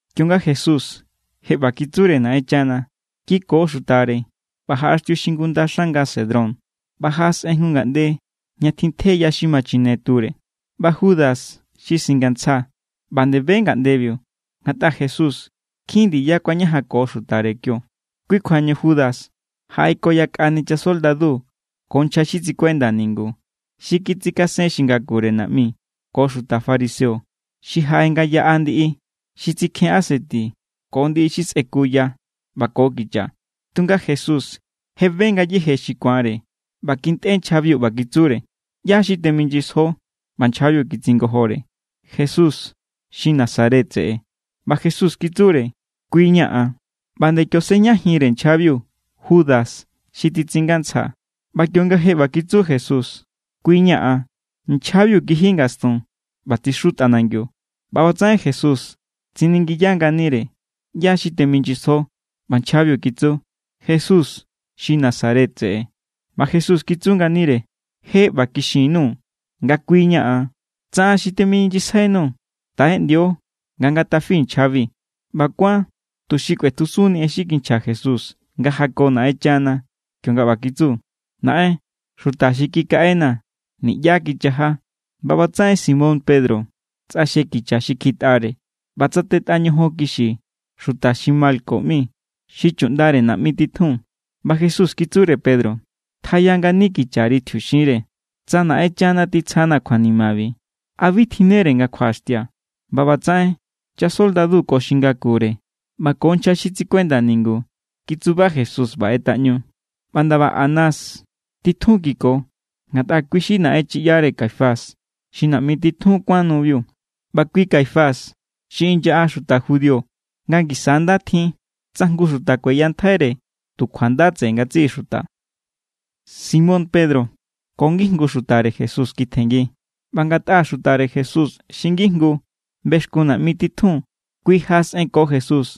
Kionga Jesús je ꞌba kitsure Naꞌenchana, kiko xutare ꞌba jaꞌaxtiu xingunda xanga Cedrón, ꞌba jaꞌasꞌen jngu ngaꞌnde ña tjintje ya xi ma chine ture. ꞌBa Judas xi singantsja ꞌba nde be ngaꞌndebiu, ngatꞌa Jesús nkjin ndiya kuañajanko xutare kio. Kui kjuañu Judas jaꞌeko yakꞌani chasoldadu ko nchja xi tsikuenda ningu xi kitsikasen xi ngakure naꞌmi ko xuta fariseo xi jaꞌe nga yaꞌa ndiꞌi xi tsikjen aseti ko ndiꞌi xi sꞌekuya ꞌba ko kicha. Tunga Jesús je be ngayéje xi ku̱anre ꞌba kintꞌe nchjabiu ꞌba kitsure: —¿ꞌYá= xi temijnyisjo? ꞌBa nchjabiu kitsingojore: —Jesús xi Nazaret tseꞌe. ꞌBa Jesús kitsure: —Kui= ña̱ an. ꞌBa nde kio sejñajinre nchjabiu Judas xi titsingantsja. ꞌBa kionga je ꞌba kitsu Jesús: “Kui= ña̱ an”, nchjabiu kiji ngastun ꞌba tsixu tꞌanangiu. ꞌBa ꞌbatsaꞌen Jesús tsiningiya nganire: —¿ꞌYá= xi temijnyisjo? ꞌBa nchjabiu kitsu: —Jesús xi Nazaret tseꞌe. ꞌBa Jesús kitsu nganire: —Je ꞌba kixin_nuu̱ nga kui= ña̱ an. Tsa an xi temijnyisjainuu̱, taꞌeꞌndio nga ngatafi nchjabi. ꞌBa kuán tuxi kꞌuetjusunni en xi kinchja Jesús nga jako Naꞌenchana, kionga ꞌba kitsu: “Naꞌen, xuta xi kikaꞌenaa̱, niꞌyá kichaja.” ꞌBa ꞌbatsaꞌen Simón Pedro tsꞌaxje kicha xi kjitꞌare ꞌba tsatetꞌa ñojon kixi xuta xi Malco ꞌmi, xi chuꞌndare naꞌmi titjun. ꞌBa Jesús kitsure Pedro: —Tjaya ngani kichari tjiuxinre. Tsa Naꞌenchana titsjana̱ kjuanimabi, ¿a bi tjinnere nga kjuaꞌaxtia̱? ꞌBa ꞌbatsaꞌen chasoldadu ko xi ngakure ꞌba ko nchja xi tsikuenda ningu kitsuba Jesús ꞌba ꞌetꞌaꞌñu. ꞌBa ndaba Anás titjun kiko, ngatꞌa kui xi naꞌenchiꞌyare Caifás xi naꞌmi titjun kuán nubiu. ꞌBa kui Caifás xi inyaꞌa xuta judío nga ngisa= nda tjin tsa jngu xuta kueyantjaire tu kjuanda tseꞌe ngatsiꞌi xuta. Simón Pedro ko ngijngu xutare Jesús kitjenngi. ꞌBa ngatꞌa xutare Jesús xi ngijngu bexkun naꞌmi titjun kui jaꞌasꞌenko Jesús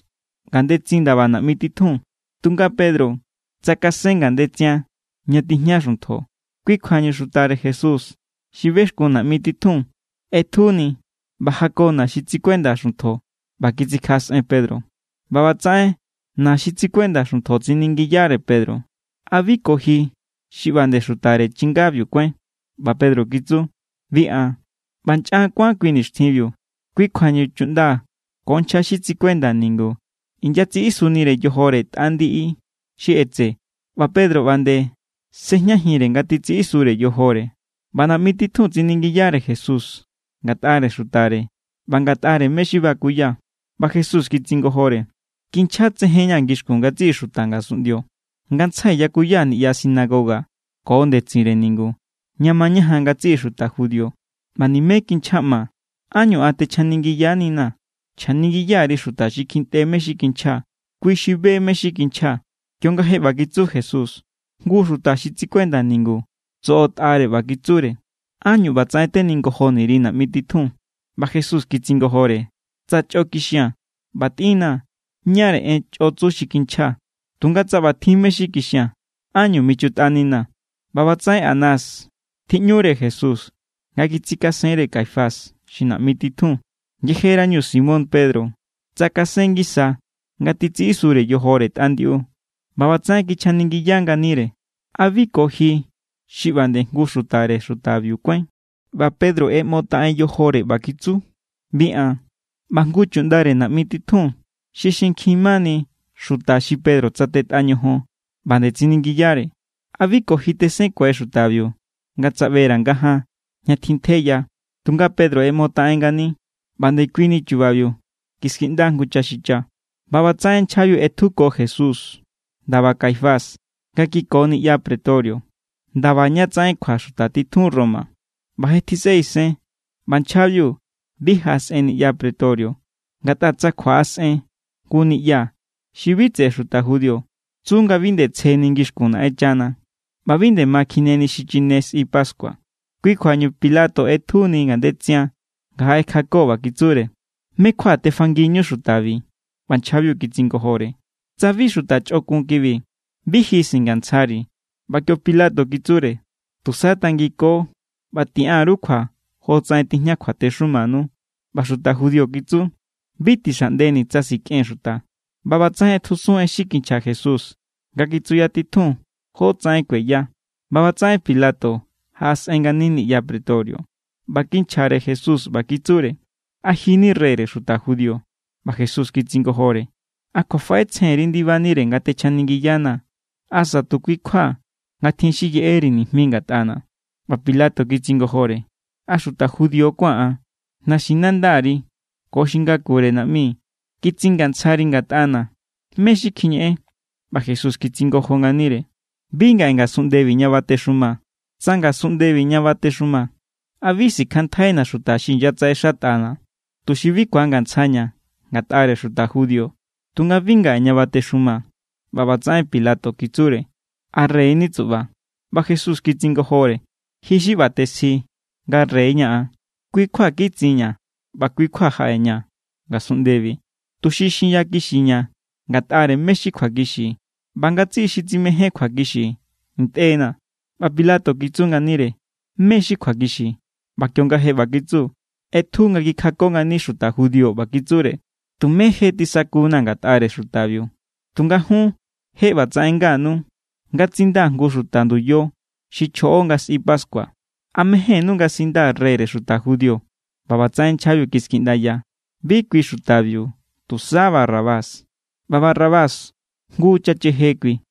ngandetsin ndaba naꞌmi titjun. Tunga Pedro tsakasen ngandetsian ña tijña xuntjo. Kui kjuañu xutare Jesús xi bexkun naꞌmi titjun ꞌetjuni ꞌba jako na xi titsikuenda xuntjo ꞌba kitsikjaꞌasꞌen Pedro. ꞌBa ꞌbatsaꞌen na xi titsikuenda xuntjo tsiningiyare Pedro: —¿A bi ko ji xi ꞌba nde xutare chingabiu kuáin? ꞌBa Pedro kitsu: —Bi an. ꞌBa nchꞌan kuán kui nixtjinbiu. Kui kjuañu chuꞌnda ko nchja xi tsikuenda ningu inyatsiꞌisunire yojore tꞌa ndiꞌi xi ꞌetse, ꞌba Pedro ꞌba nde sꞌejñajinre nga titsiꞌisure yojore. ꞌBa naꞌmi titjun tsiningiyare Jesús ngatꞌare xutare ꞌba ngatꞌare mé= xi bakuya. ꞌBa Jesús kitsingojore: —Kinchjatsejen=ña̱ ngixkun ngatsiꞌi xuta ngasunꞌndio. Ngantsjai yakuya niꞌya sinagoga ko ndetsinre ningu, ña mañajan ngatsiꞌi xuta judío. ꞌBa nimé kinchjaꞌmaa̱. ¿Ánñu an techjaningiyaninaa̱? Chjaningiya_ri xuta xi kjintꞌe mé= xi kinchjaa̱. Kui xi be= mé= xi kinchjaa̱. Kionga je ꞌba kitsu Jesús jngu xuta xi tsikuenda ningu tsoꞌotꞌare ꞌba kitsure: —¿Ánñu ꞌbatsaꞌen teningojoni_ri naꞌmi titjun? ꞌBa Jesús kitsingojore: —Tsa chꞌo kixia̱n, ꞌba tꞌinnaa̱ ñáre en chꞌotsu xi kinchjaa̱. Tunga tsa ꞌbatjin mé= xi kixia̱n, ¿ánñu michutꞌaninaa̱? ꞌBa ꞌbatsaꞌen Anás tjiꞌñure Jesús nga kitsikasenre Caifás xi naꞌmi titjun. Yejerañu Simón Pedro tsakasen ngisa nga titsiꞌisure yojore tꞌa ndiꞌu. ꞌBa ꞌbatsaꞌen kichjaningiya nganire: —¿A bi ko ji xi ꞌba nde jngu xutare xutabiu kuáin? ꞌBa Pedro ꞌeꞌmotaꞌen yojore ꞌba kitsu: —Bi an. ꞌBa jngu chuꞌndare naꞌmi titjun xi xinkjin mani xuta xi Pedro tsatetꞌa ñojon ꞌba nde tsiningiyare: —¿A bi ko ji tesenkue xutabiu nga tsaꞌbera̱ ngajaan, ña tjintje ya? Tunga Pedro ꞌeꞌmotaꞌen ngani. ꞌBa ndekuini chubabiu kiskiꞌnda jngu chaxicha. ꞌBa ꞌbatsaꞌen nchjabiu ꞌetjuko Jesús ndaba Caifás nga kiko niꞌya pretorio, ndaba ña tsaꞌen kjua xuta titjun Roma. ꞌBa je tjisꞌe isen. ꞌBa nchjabiu bi jaꞌasꞌen niꞌya pretorio, ngatꞌa tsa kjuaꞌasꞌen jngu niꞌya xi bi tseꞌe xuta judío, tsu nga bi nde tsjeni ngixkun Naꞌenchana ꞌba bi nde ma kjineni xichine sꞌi pascua. Kui kjuañu Pilato ꞌetjuni ngandetsian nga jaꞌekjako ꞌba kitsure: —¿Mé= kjua tefangiñu xutabi? ꞌBa nchjabiu kitsingojore: —Tsa bi xuta chꞌokun kibi, bi ji singatsjari̱. ꞌBa kio Pilato kitsure: —Tusa tangiko ꞌba tiꞌan_ru kjua jotsaꞌen tijña kjuatexumanu. ꞌBa xuta judío kitsu: —Bi tixaꞌndeni̱ tsa sikꞌen xuta. ꞌBa ꞌbatsaꞌen ꞌetjusun en xi kinchja Jesús nga kitsuyatitjun jotsaꞌen kueya. ꞌBa ꞌbatsaꞌen Pilato jaꞌasꞌen ngani niꞌya pretorio ꞌba kinchjare Jesús ꞌba kitsure: —¿A ji= ni reyre xuta judío? ꞌBa Jesús kitsingojore: —¿A kjuafaꞌetsjenri ndibanire nga techjaningiyanaa̱? ¿Asa tu kui= kjua nga tjin xi yeꞌeri nijmi ngatꞌana̱? ꞌBa Pilato kitsingojore: —¿A xuta judío kuáa̱n an? Naxinandari ko xi ngakure naꞌmi kitsingantsjari ngatꞌana̱. ¿Mé= xi kjiñeꞌen? ꞌBa Jesús kitsingojo nganire: —Bi ngaꞌe ngasunꞌndebi ña batexumaa̱. Tsa ngasunꞌndebi ña batexumaa̱, ¿a bi sikjanntjaina̱ xuta xi inyatsaꞌexatꞌana̱, tuxi bi ku̱angantsjaña̱ ngatꞌare xuta judío? Tunga bi ngaꞌe ña batexumaa̱. ꞌBa ꞌbatsaꞌen Pilato kitsure: —¿A rey= ni tsuꞌba? ꞌBa Jesús kitsingojore: —Ji xi ꞌba tesji nga rey= ña̱ an. Kui= kjua kitsinña̱ ꞌba kui= kjua jaꞌeña̱ ngasunꞌndebi, tuxi xinyakixiña̱ ngatꞌare mé= xi kjuakixi. ꞌBa ngatsiꞌi xi tsimején kjuakixi ntꞌe=na̱. ꞌBa Pilato kitsu nganire: —¿Mé= xi kjuakixi? ꞌBa kionga je ꞌba kitsu, ꞌetju nga kikjako ngani xuta judío ꞌba kitsure: —Tumé je tisakuna̱ ngatꞌare xutabiu. Tunga jun je ꞌbatsaꞌen nganu, nga tsindaa̱ jngu xuta nduya xi chjoꞌo nga sꞌi pascua. ¿A mejénnú nga sindaa̱ reyre xuta judío? ꞌBa ꞌbatsaꞌen nchjabiu kiskiꞌndaya: —¡Bi kui xutabiu! ¡Tu̱sá Barrabás! ꞌBa Barrabás, jngu chacheje kui.